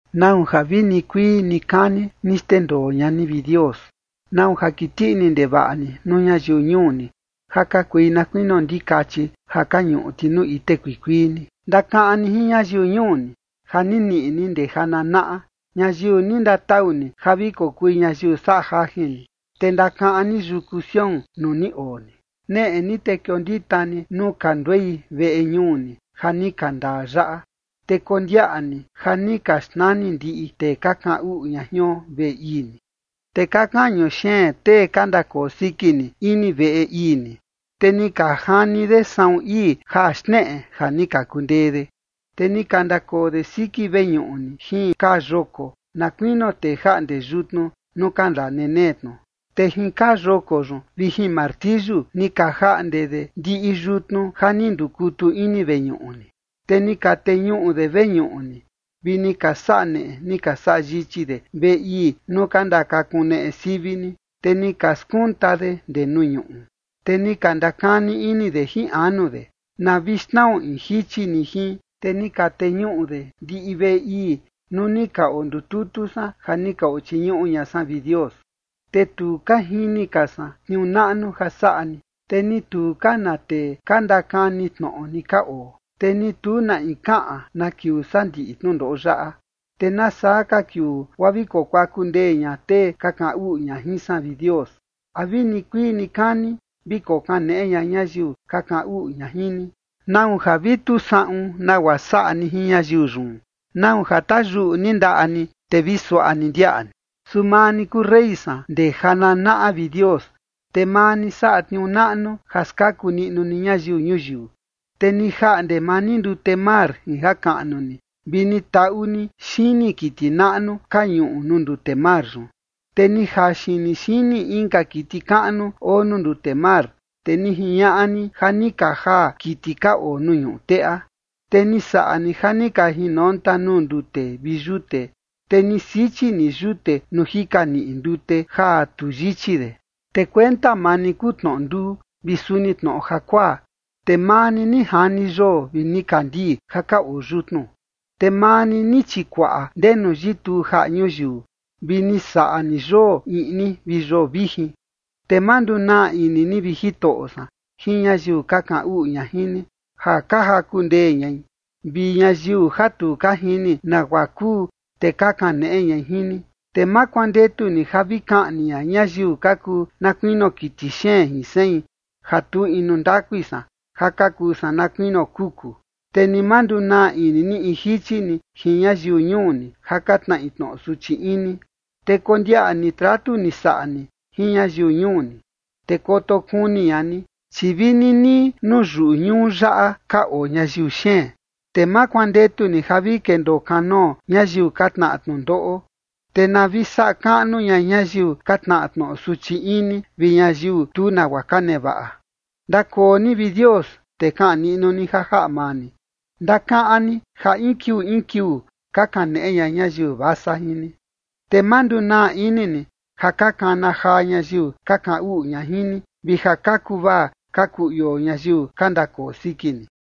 ¿Nau ja vi nikuii nikani ni xndendoo ña ni, vi Dios? ¿Nau ja kiti ini ndevaꞌa ni nuu ñayiu ñuu ni ja ka kui na kuinio ndikachi ja ka ñuꞌu ti nuu ite kuikuii ni? Ndakaꞌan ni jin ñayiu ñuu ni ja ni niꞌi ni ndee jananaꞌa, ñayiu ni ndatau ni ja vi kokui ñayiu saꞌa jajin ni, te ndakaꞌan ni yuku Sión nuu ni oo ni. Neꞌe ni te kiondita ni nuu ka nduei veꞌe ñuu ni ja ni ka ndaa yaꞌa, te kondiaꞌa ni ja ni ka xnani ndiꞌi tee ka kaꞌan uꞌu ña jion veꞌe ii ni. Te ka kañu xeen tee ka ndakoo siki ni ini veꞌe ii ni, te ni ka jani de saꞌun ii ja xneꞌe ja ni ka kundee de. Te ni ka ndakoo de siki veñuꞌu ni jin kaa yoko, na kuinio tee jaꞌnde yutnu nuu ka ndaa nenee tnu. Te jin kaa yoko yun vi jin martiyu ni ka jaꞌnde de ndiꞌi yutnu ja ni ndukutu ini veñuꞌu ni. Te ni ka teñuꞌu de veñuꞌu ni, vi ni ka saꞌa neꞌe ni ka saꞌa yichi de veꞌe ii nuu ka ndakakuneꞌe sivi ni, te ni ka skunta de ndee nuu ñuꞌu. Te ni ka ndakani ini de jin anu de: “Na vi xnao in jichi ni jin”. Te ni ka teñuꞌu de ndiꞌi veꞌe ii nuu ni ka ondututu san ja ni ka ochiñuꞌu ña san, vi Dios. Te tu ka jini ka san tniuu naꞌnu ja saꞌa ni, te ni tu ka na tee ka ndakani tnoꞌo ni ka oo, te ni tu na in kaꞌan na kiuu saa ndiꞌi tnundoꞌo yaꞌa. ¿Te nasaa ka kiuu guaa vi kokuaku ndee ña tee ka kaꞌan uꞌu ña jin san, vi Dios? ¿A vi nikuii nikani vi kokaneꞌe ña ñayiu ka kaꞌan uꞌu ña jin ni? ¿Nau ja vi tu saꞌun nagua saꞌa ni jin ñayiu yun? ¿Nau ja tayuꞌu ni ndaꞌa ni, te vi suaꞌa ni ndiaꞌa ni? Su maa ni kuu rey san ndee jananaꞌa, vi Dios, te maa ni saꞌa tniuu naꞌnu ja skaku niꞌnu ni ñayiu ñuyiu. Te ni jaꞌnde maa ni ndute mar jin ja kaꞌnu ni, vi ni taꞌu ni xini kiti naꞌnu ka ñuꞌu nuu ndute mar yun. Te ni jaxin ni xini inka kiti kaꞌnu oo nuu ndute mar, te ni jiñaꞌa ni ja ni ka jaa kiti ka oo nuu ñuꞌu teꞌa. Te ni saꞌa ni ja ni ka jinonta nuu ndute vi yute, te ni sichi ni yute nuu jika niꞌi ndute ja tu yichi de. Te kuenta maa ni kuu tnoꞌo nduu vi suni tnoꞌo jakuaa, te maa ni, ni jani yoo vi nikandii ja ka oo yutnu. Te maa ni, ni chikuaꞌa ndenu yituu jaꞌa ñuyiu, vi ni saꞌa ni yoo iꞌni vi yoo vijin. Te ma ndunaa ini ni, vi Jitoꞌo san, jin ñayiu ka kaꞌan uꞌu ña jin ni, ja ka jaku ndee ñai, vi ñayiu ja tu ka jini nagua kuu, te ka kaneꞌe ñai jin ni. Te ma kuandetu ni ja vi kaꞌni ña ñayiu ka kuu na kuinio kiti xeen, jin sein ja tu inu ndakui san ja ka kuu san na kuinio kuku. Te ni ma ndunaa ini ni in jichi ni jin ñayiu ñuu ni ja ka tnaꞌi tnoꞌo suchi ini. Te kondiaꞌa ni tratu ni saꞌa ni jin ñayiu ñuu ni, te koto kuni ña ni, chi vi ninii nuu yuꞌu ñuu yaꞌa ka oo ñayiu xeen. Te ma kuandetu ni ja vi kendoo kanoo ñayiu ka tnaꞌa tnundoꞌo, te na vi saꞌa kaꞌnu ña ñayiu ka tnaꞌa tnoꞌo suchi ini vi ñayiu tu nagua ka nevaꞌa. Ndakoo ni, vi Dios, te kaꞌan niꞌnu ni ja jaꞌa maa ni. Ndakaꞌan ni ja in kiuu in kiuu, ka kaneꞌe ña ñayiu vasa jin ni. Te ma ndunaa ini ni ja ka kana jaa ñayiu ka kaꞌan uꞌu ña jin ni, vi ja ka kuvaa ka kuu ioo ñayiu ka ndakoo siki ni.